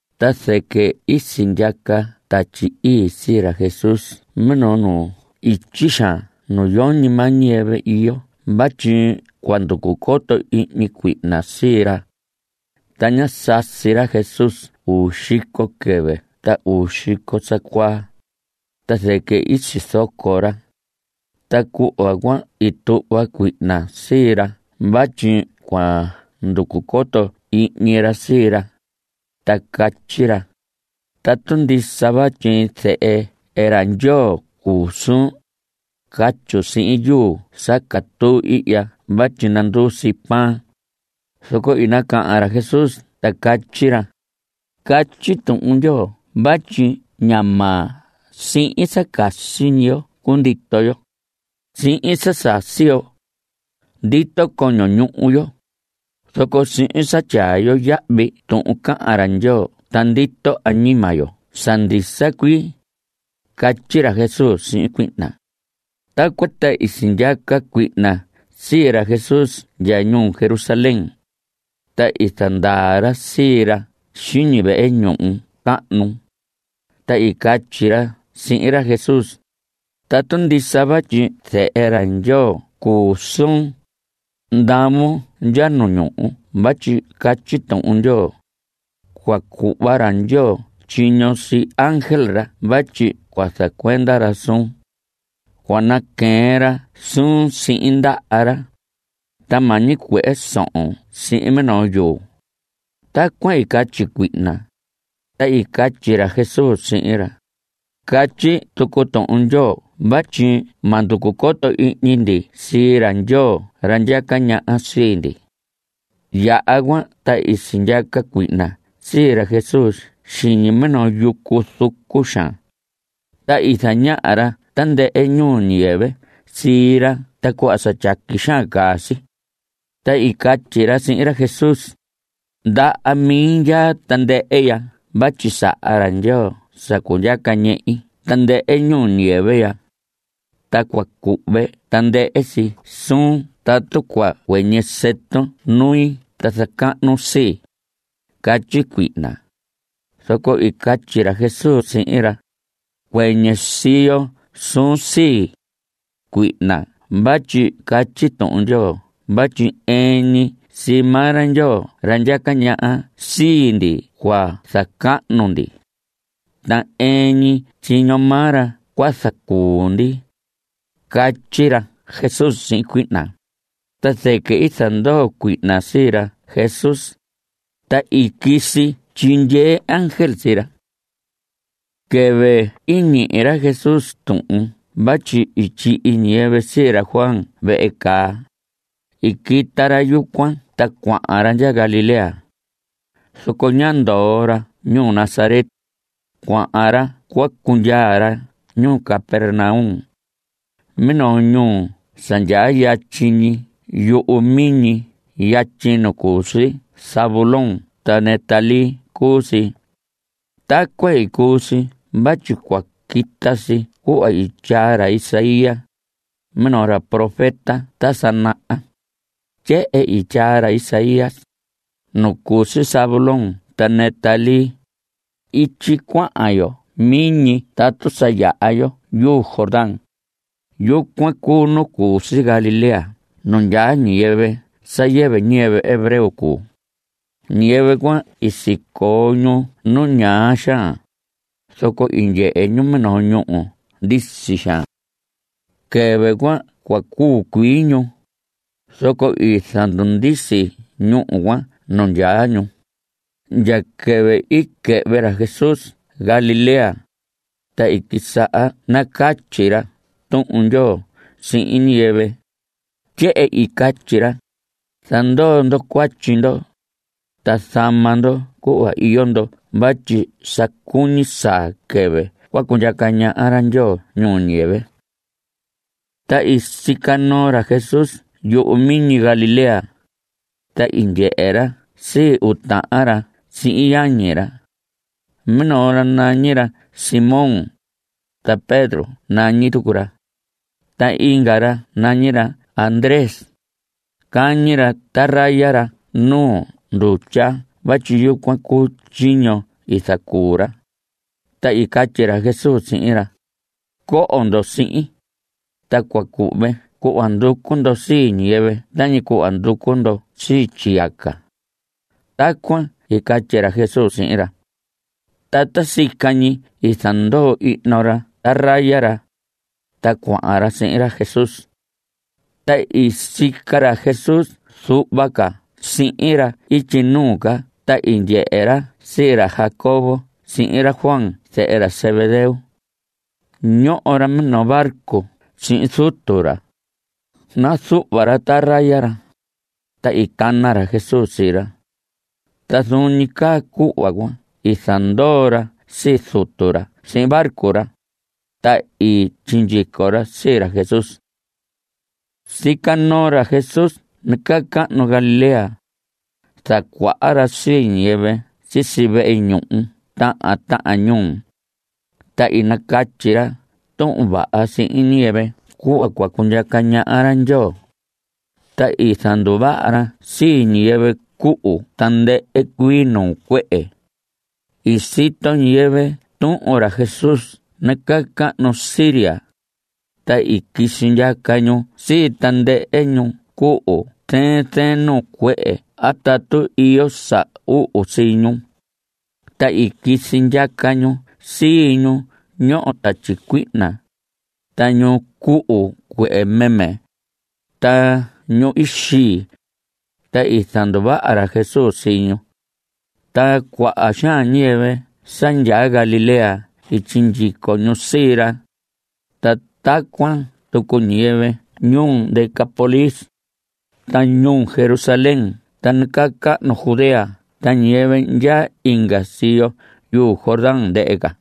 Ta zɨquɨ i sindyaca Tatyi Ii sii ra Jesús minoo nu ityi xaan nu yoñi maa ñiyɨvɨ iyo vatyi cua nducu coto ihñi cuihna sii ra. Ta ñá sasi ra Jesús uu xico quɨvɨ ta uu xico sa cuaa, ta zɨquɨ i sizoco ra. Ta cuhva cuan i tuhva cuihna sii ra vatyi cua nducu coto ihñi ra sii ra, ta catyi ra: Tatu ndisa vatyi Zehe ra Ndyoo cuu suun, catyun sihin yuu sa catuu ihya vatyi nanduu si pan. Zoco i nacahan ra Jesús ta catyi ra: Catyi Tuhun Ndyoo vatyi ña maa sihin sa casi ñi yo cundito yo. Sihin sa sasi yo ndito coño ñuhu yo, zoco sihin sa tyaa yo yahvi tuhun cahan ra Ndyoo ta ndito añima yo sa ndisa cuii. Catyi ra Jesús sihin cuihna. Tacuan ta i sindyaca cuihna sii ra Jesús ndya ñuu Jerusalén. Ta i zandaa ra sii ra xiñi vehe ñuhu cahnu. Ta i catyi ra sihin ra Jesús: Tatu ndisa vatyi Zehe ra Ndyoo cuu suun, ndavon ndya nu ñuhu vatyi catyi Tuhun Ndyoo: “Cua cuhva ra Ndyoo tyiño sii ángel ra vatyi zacuenda ra suun. Cua naqueen ra suun sihin ndaha ra, ta ma ñicuehe sohon sihin minoo yuu.” Tacuan i catyi cuihna, ta i catyi ra Jesús sihin ra: Catyi tucu Tuhun Ndyoo vatyi ma nducu coto ihñi ndi sii ra Ndyoo ra ndyaca ñaha sii ndi. Yaha cuan ta i sindyaca cuihna sii ra Jesús xiñi minoo yucu zucu xaan, ta i zañaha ra tandɨhɨ ñuu ñiyɨvɨ sii ra ta cuhva sa tyaqui xaan caa si. Ta i catyi ra sihin ra Jesús: Ndaha mi ndyaa tandɨhɨ ya vatyi saha ra Ndyoo sa cundyaca ñehi tandɨhɨ ñuu ñiyɨvɨ ya. Ta cua cuhve tandɨhɨ si suun tatu cua cuɨñɨ sɨtun nui ta zacahnun sii. Catyi cuihna. Zoco i catyi ra Jesús sihin ra: Cuɨñɨ siyo suun sii, cuihna vatyi catyi Tuhun Ndyoo vatyi ɨɨn ñi sii maa ra Ndyoo ra ndyaca ñaha sii ndi cua zacahnu ndi. Ta ɨɨn ñi tyiño maa ra cua zacuu ndi. Catyi ra Jesús sihin cuihna. Ta zɨquɨ i zandoo cuihna sii ra Jesús, ta i quisi tyindyee ángel sii ra. Quɨvɨ i ñihi ra Jesús tuhun vatyi i tyihi ñiyɨvɨ sii ra Juan vehe caa, i quita ra yucuan ta cuahan ra ndya Galilea. Zoco ñá ndoo ra ñuu Nazaret. Cuahan ra cua cundyaa ra ñuu Capernaum. Minoo ñuu sa ndyaa yatyi ñi yuhu miñi yatyi nu cu si Zabulón ta Neftalí cuu si. Tacuan i cuu si vatyi cua quita si cuhva i tyaa ra Isaías, minoo ra profeta ta sa naha. Tyehen i tyaa ra Isaías: Nu cu si Zabulón ta Neftalí, ityi cuahan yo miñi tatu sa yaha yo yuu Jordán, yucuan cuu nu cu si Galilea nu ndyaa ñiyɨvɨ sa yɨvɨ ñiyɨvɨ hebreo cuu. Ñiyɨvɨ cuan sicoo ñu nu ñaa xaan, zoco i ndyehe ñu minoo ñúhu ndisi xaan. Quɨvɨ cuan cua cuu cuii ñu, zoco i zandundisi ñúhu cuan nu ndyaa ñu. Ndya quɨvɨ i quɨhvɨ ra Jesús Galilea, ta i quisaha nacatyi ra Tuhun Ndyoo sihin ñiyɨvɨ. Tyehen i catyi ra: Zandoo ndo cuatyi ndo, ta zama ndo cuhva iyo ndo vatyi sa cuñi saa quɨvɨ cua cundyaca ñaha ra Ndyoo ñuu ñiyɨvɨ. Ta i sica noo ra Jesús yuhu miñi Galilea. Ta i ndyehe ra sii uu tahan ra sihin yañi ra. Minoo ra nañi ra Simón, ta Pedro nañi tucu ra. Ta inga ra nañi ra Andrés. Cañi ra traya ra nu ndutya vatyi yucuan cuu tyiño i zacuu ra. Ta i catyi ra Jesús sihin ra: Coho ndo sihin, ta cua cuhve cuhva nducu ndo sii ñiyɨvɨ tañi cuhva nducu ndo sii tyiyaca. Tacuan i catyi ra Jesús sihin ra. Ta ta sica ñi i zandoo ihno ra traya ra, ta cuahan ra sihin ra Jesús. Ta i sica ra Jesús zuhva ca sihin ra ityi nuu ca ta i ndyehe ra sii ra Jacobo sihin ra Juan zehe ra Zebedeo. Ñoho ra minoo barco sihin zutu ra. Nazuhva ra traya ra. Ta i cana ra Jesús sii ra. Ta zuun ñi caa cuhva cuan i zandoo ra sii zutu ra sihin barco ra, ta i sindyico ra sii ra Jesús. Sica noo ra Jesús nacahnu Galilea. Zacuaha ra sii ñiyɨvɨ sisi vehe ñuhu tahan tahan ñuu. Ta nacatyi ra Tuhun Vaha sihin ñiyɨvɨ cuhva cua cundyaca ñaha ra Ndyoo. Ta i zanduvaha ra sii ñiyɨvɨ cuhu tandɨhɨ cuii nuu cuehe. I sito ñiyɨvɨ tuhun ra Jesús nacahnu Siria. Ta i quisi ndyaca ñu sii tandɨhɨ ñu cuhu zɨɨn zɨɨn nuu cuehe a tatu iyo sa uhu sii ñu. Ta i quisi ndyaca ñu sii ñu ñoho tatyi cuihna, ta ñu cuhu cuehe meme, ta ñu xii. Ta i zanduvaha ra Jesús sii ñu. Ta cuaha xaan ñiyɨvɨ sa ndyaa Galilea i sindyico ñu sii ra. Ta tacuan tucu ñiyɨvɨ ñuu Decápolis, ta ñuu Jerusalén ta nacahnu Judea ta ñiyɨvɨ ndyaa inga siyo yuu Jordán ndɨhɨ ca.